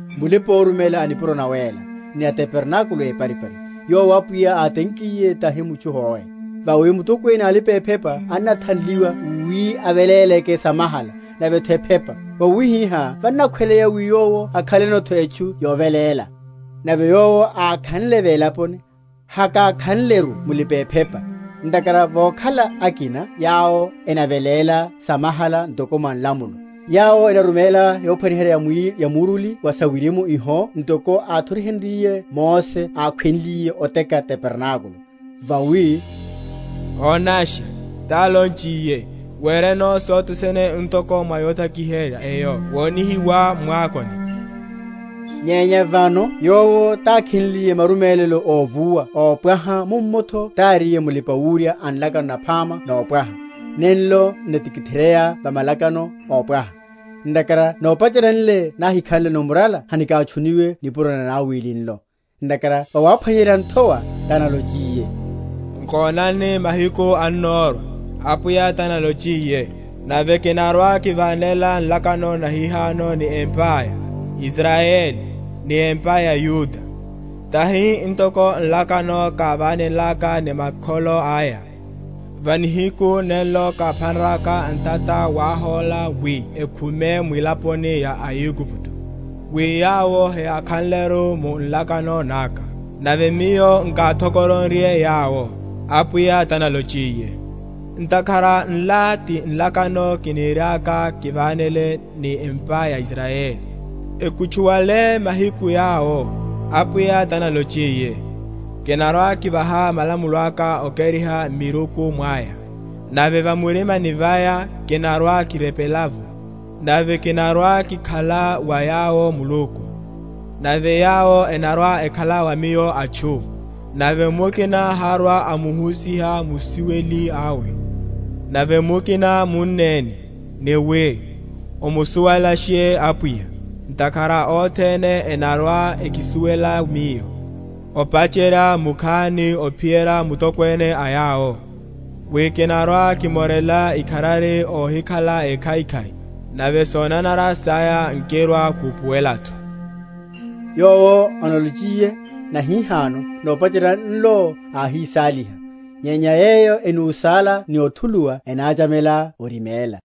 Mulipa‐oruméla a nipuro nawéla, ni a tabernákulo éparipari, yowo Apwiya átenkiye, tahi mutchu hoe. Vawi mutokwene a alipa‐ephepa anathanliwa wi aveléleke samahala, navetho ephepa; vawihiha vannakhweleya wi yowo akhalenotho etchu yoveléla. Nave Yowo ákhanle velaponi, hakakhanleru mulipa‐ephepa, ntakhara vokhala akina yawo enaveléla samahala ntoko mwa nlamulo; yawo enaruméla yophwaniherya ni muruli wa sawirimu iho ntoko áthoriheryiwiye Mose ákhweliye oteka tabernákulo: vawi, Onasha, tálonchiye, wereno sothe sene ntoko mwa yotakiherya eyo wonihiwá mwakoni. Nyenya vano Yowo tákhenliye marumélelo óvuwa ópwaha, mummotho taríye Mulipawurya a nlakano naphama nopwaha, nenlo n’natikitheryeya va malakano ópwaha. Ntakhara nopacherya nle nahákhanleno murala hinakatchuniwe nipuro na nanawili nlo. Ntakhara vawaphwanyerya nthowa, tanalochiye, Nkonani, mahiku annorwa, Apwiya tanalochiye, Nave kinarwa‐kivánela nlakano nahihano ni empa ya Israyeli, ni empa ya Yuda, Tahi ntoko nlakano kávánenlaka ni makholo aya, Va nihiku nenlo káphanraka ntata wáhóla wi ekhume mwilaponi ya Aigupto; Wi yawo heyákhanleru mu nlakano naka. Nave Miyo nkáthokoronrye yawo, Apwiya tanalochiye. Ntakhara nla ti nlakano kiniriaka kivánele ni empa ya Israyeli, Ekutchuwale mahiku yawo, Apwiya tanalochiye; Kinarwa‐kivaha malamulo aka okeriha m’miruku mwaya, Nave va murimani vaya kinarwa‐kirepela’vo. Nave kinarwa‐kikhala wa yawo Muluku, Nave yawo enarwa‐ekhala wa Miyo atchu: Nave mukina harwa‐amuhusiha musuweli awe, Nave mukina munneni, ni wi, Omusuwelashe Apwiya. Ntakhara othene enarwa‐ekisuwela Miyo, Opacherya mukhani ophiyerya mutokwene a yawo. Wi kinarwa‐kimorela ikharari óhikhala ékhaikhai, Nave sonanara saya nkirwa‐kupuwelatho. Yowo analochiye, Nahihano, nopacherya nlo áhísáliha. Nyenya yeyo enúsála ni othuluwa ennachamela oriméla.